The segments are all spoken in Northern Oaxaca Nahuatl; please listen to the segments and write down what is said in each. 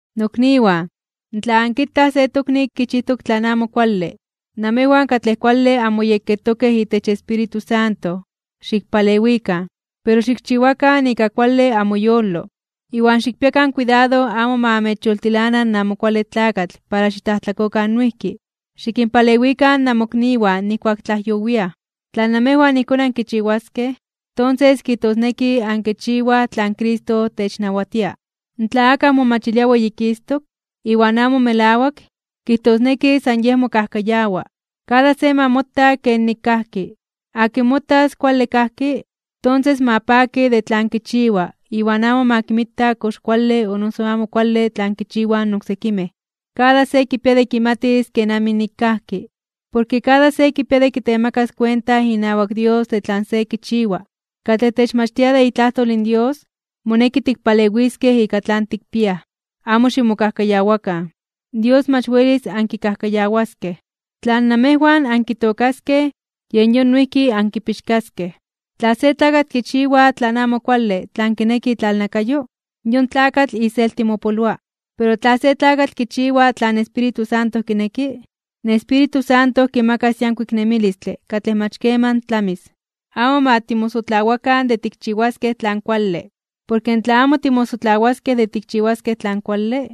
Nokniwan, tla ankitaj se tokni kichijtok tlan amo kuale, namejwan katlej kuale anmoyekketokej itech Espíritu Santo, xikpalewikan. Pero xikchiwakan ika kuale amoyolo, iwan xikpiakan kuidado amo ma amechyoltilana in Amo Kuale Tlakatl para xitlajtlakokan noijki. Xikinpalewikan namokniwan nijkuak tlajyowiaj. Tla namejwan ijkón ankichiwaskej, tonses kijtosneki ankichiwaj tlan Cristo technawatia. Tla akaj momachilia weyikistok (weyititok), iwan amo melawak, kijtosneki san yej mokajkayawa. Kada se ma mota kenik kajki. Akin motas kuale kajki, tonses ma paki de tlan kichiwa iwan amo ma kinmita kox kuale o noso amo kuale tlan kichiwaj in oksekimej. Kada se kipia de kimatis kenamij nik kajki, porke kada se kipia de kitemakas kuenta inawak Dios de tlan se kichiwa. Katlej techmachtia de itlajtol in Dios, moneki tikpalewiskej ika tlan tikpiaj. Amo ximokajkayawakan. Dios mach welis ankikajkayawaskej. Tlan namejwan ankitookaskej, yen yon noijki ankipixkaskej. Tla se tlakatl kichiwa tlan amo kuale tlan kineki itlalnakayo, yon tlakatl iselti mopoloa. Pero tla se tlakatl kichiwa tlan Espíritu Santo kineki, in Espíritu Santo kimakas yankuik nemilistle katlej mach keman tlamis. Amo ma timosotlawakan de tikchiwaskej tlan kuale, porke tla amo timosotlawaskej de tikchiwaskej tlan kuale,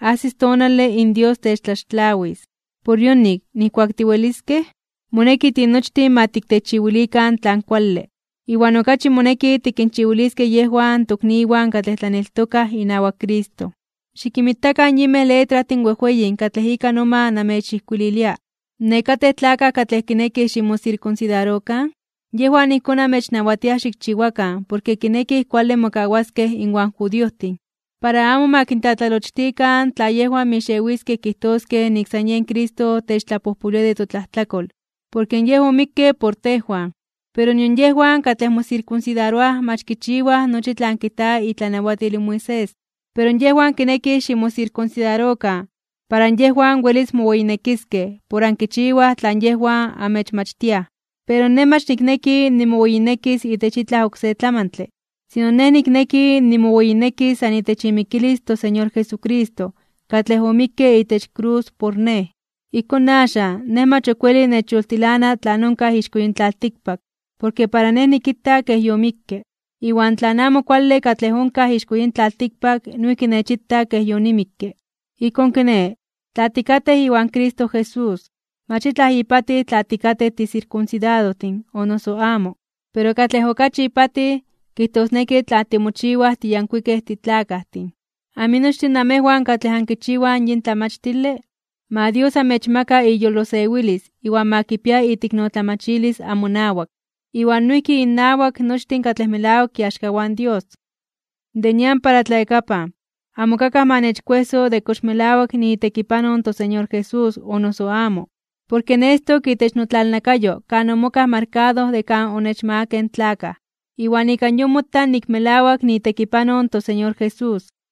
ajsis tonale in Dios techtlaxtlawis. Por yonik, nijkuak tiweliskej, moneki tinochtin ma tiktechiwilikan tlan kuale, iwan okachi moneki tikinchiwiliskej yejwan tokniwan katlej tlaneltokaj inawak Cristo. Xikinmitakan yinmej letrajtin wejweyin katlej ika noma namechijkuililia. Nekatej tlakaj katlej kinekij ximosirkunsidarokan yejwan ijkón amechnawatiaj xikchiwakan porke kinekij kuale mokawaskej inwan judiojtin, para amo ma kintlatlalochtikan tla yejwan mixewiskej kijtoskej nik san yen Cristo techtlapojpolwia de totlajtlakol porke Yej omikke por tejwan. Pero nion yejwan katlej mosirkunsidaroaj mach kichiwaj nochi tlan kijta itlanawatil in Moisés. Pero yejwan kinekij ximosirkunsidarokan para yejwan welis moweyinekiskej por ankichiwaj tlan yejwan amechmachtiaj. Pero nej mach nikneki nimoweyinekis itech itlaj oksé tlamantle, sino nej nikneki nimoweyinekis san itech imikilis in toSeñor Jesucristo katlej omikke itech krus por nej. Ijkón axan nej mach ok weli nechyoltilana tlan onkaj ixko yin tlaltikpak porke para nej nikita kej yomikke. Iwan tlan amo kuale katlej onkaj ixko yin tlaltikpak noijki nechita kej yonimikke. Ijkón kiné, tla tikatej iwan Cristo Jesús, mach itlaj ipatij tla tikatej tisirkunsidadojtin o noso amo. Pero katlej okachi ipatij, kijtosneki tla timochiwaj tiyankuikej titlakajtin. Aminochtin namejwan katlej ankichiwaj yin tlamachtile, ma Dios amechmaka iyolosewilis iwan ma kipia iteiknotlamachilis amonawak, iwan noijki innawak nochtin katlej melawak iaxkawan Dios. De nian para tlayakapan, amo ok akaj ma nechkuejso de kox melawak niitekipanoj in toSeñor Jesús o noso amo, porke nestok itech notlalnakayo kan omokaj markado de kan onechmagakej in tlakaj, iwan ika yon mota nik melawak niitekipanoj in toSeñor Jesús.